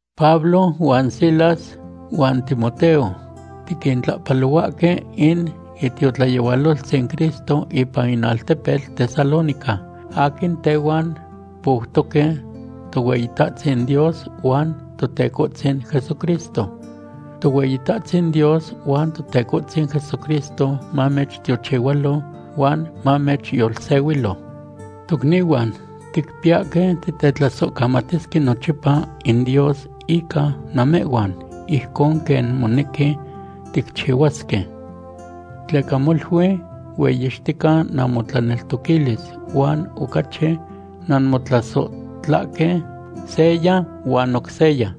Pablo huan Silas huan Timoteo tiquintlahpalohuahque in itiotlayehualoltzin Cristo ipan in altepetl Tesalónica aquin tehuan poutoque Tohueyitahtzin Dios huan Totecohtzin Jesucristo. Tohueyitahtzin Dios huan Totecohtzin Jesucristo mamechtiochihualo huan mamechyolsehuilo. Tocnihuan, ticpiyahque titetlasohcamatisque nochipa in Dios ica namehhuan ijcon quen monequi ticchihuasque. Tleca molui hueyixtica namotlaneltoquilis huan ocachi nanmotlasohtlahque seya huan oc seya.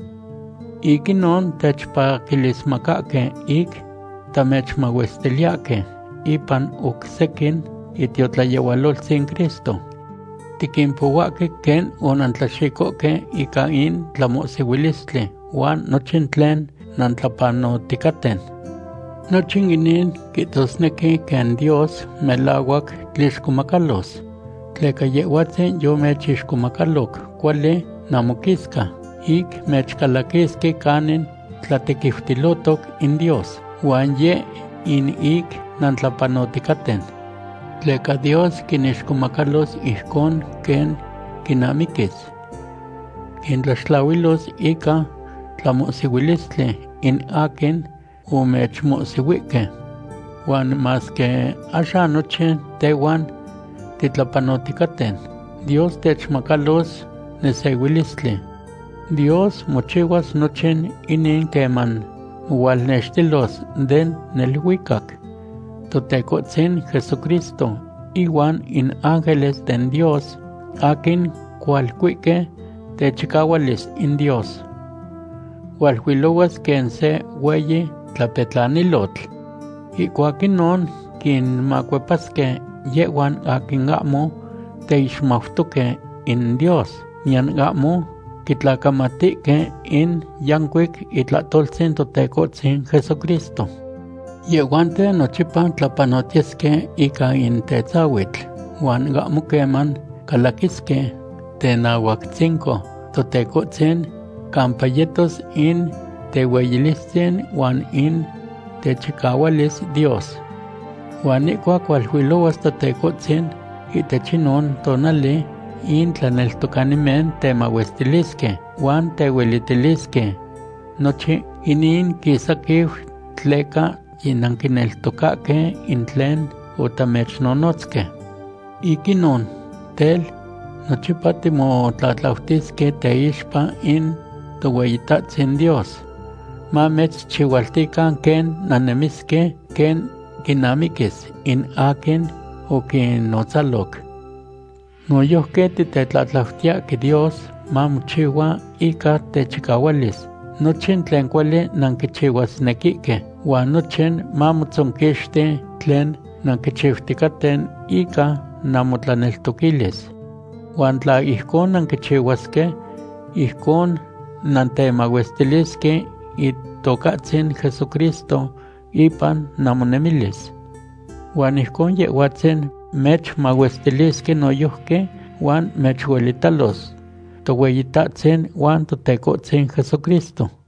Ic inon techpaquilismacahque ic tamechmahuestiliyahque ipan oc sequin itiotlayehualoltzin Cristo. Tiquimpohuahque quen onantlaxicohque ica in tlamohsihuilistli huan nochin tlen nantlapanoticaten. Nochin inin quihtosnequi quen Dios melahuac tlixcomacalos. Tleca Yehhuatzin yomechixcomacaloc cuali namoquisca ic mechcalaquisque canin tlatequiutilotoc in Dios, huan yeh in ic nantlapanoticaten. Tleca Dios quinixcomacalos ijcon quen quinamiquis. Quintlaxtlahuilos ica tlamohsihuilistli in aquin omechmohsihuihque. Huan masque axan nochin tehhuan titlapanoticaten, Dios techmacalos nesehuilistli. Dios mochihuas nochin inin queman mohualnextilos den neluicac Totecohtzin Jesucristo ihuan in ángeles den Dios aquin cualcuihque techicahualis in Dios. Hualuilohuas quen se hueyi tlapetlanilotl. Ihcuac inon quinmacuepasque yehhuan aquin ahmo teixmautoque in Dios, niyan ahmo quitlacamatihque in yancuic itlahtoltzin Totecohtzin Jesucristo. Yehhuanten nochipa tlapanotiyesque ica in tetzahuitl, huan ahmo queman calaquisque tenahuactzinco Totecohtzin campa yetos in tehueyilistzin huan in techicahualis Dios. Huan ihcuac hualuilohuas Totecohtzin, ihtech inon tonali in tlaneltocanimen temahuestasque, huan tehuelitilisque. Nochin inin quisaquiu tleca yinanquineltocahque in tlen otamechnonotzque. Ic inon, tel, nochipa timotlatlautisque teixpa in Tohueyitahtzin Dios, mamechchihualtican quen nannemisque quen quinamiquis in aquin oquinotzaloc. Noyojqui titetlatlautiyahque Dios mamochihua ica techicahualis nochin tlen cuali nanquichihuasnequihque, huan nochin mamotzonquixti tlen nanquichiuticaten ica namotlaneltoquilis. Huan tla ijcon nanquichihuasque, ijcon nantemahuestilisque Itocahtzin Jesucristo ipan namonemilis. Huan ijcon Yehhuatzin mechmahuestilisque noyojqui huan mechuelitalos Tohueyitahtzin huan Totecohtzin Jesucristo.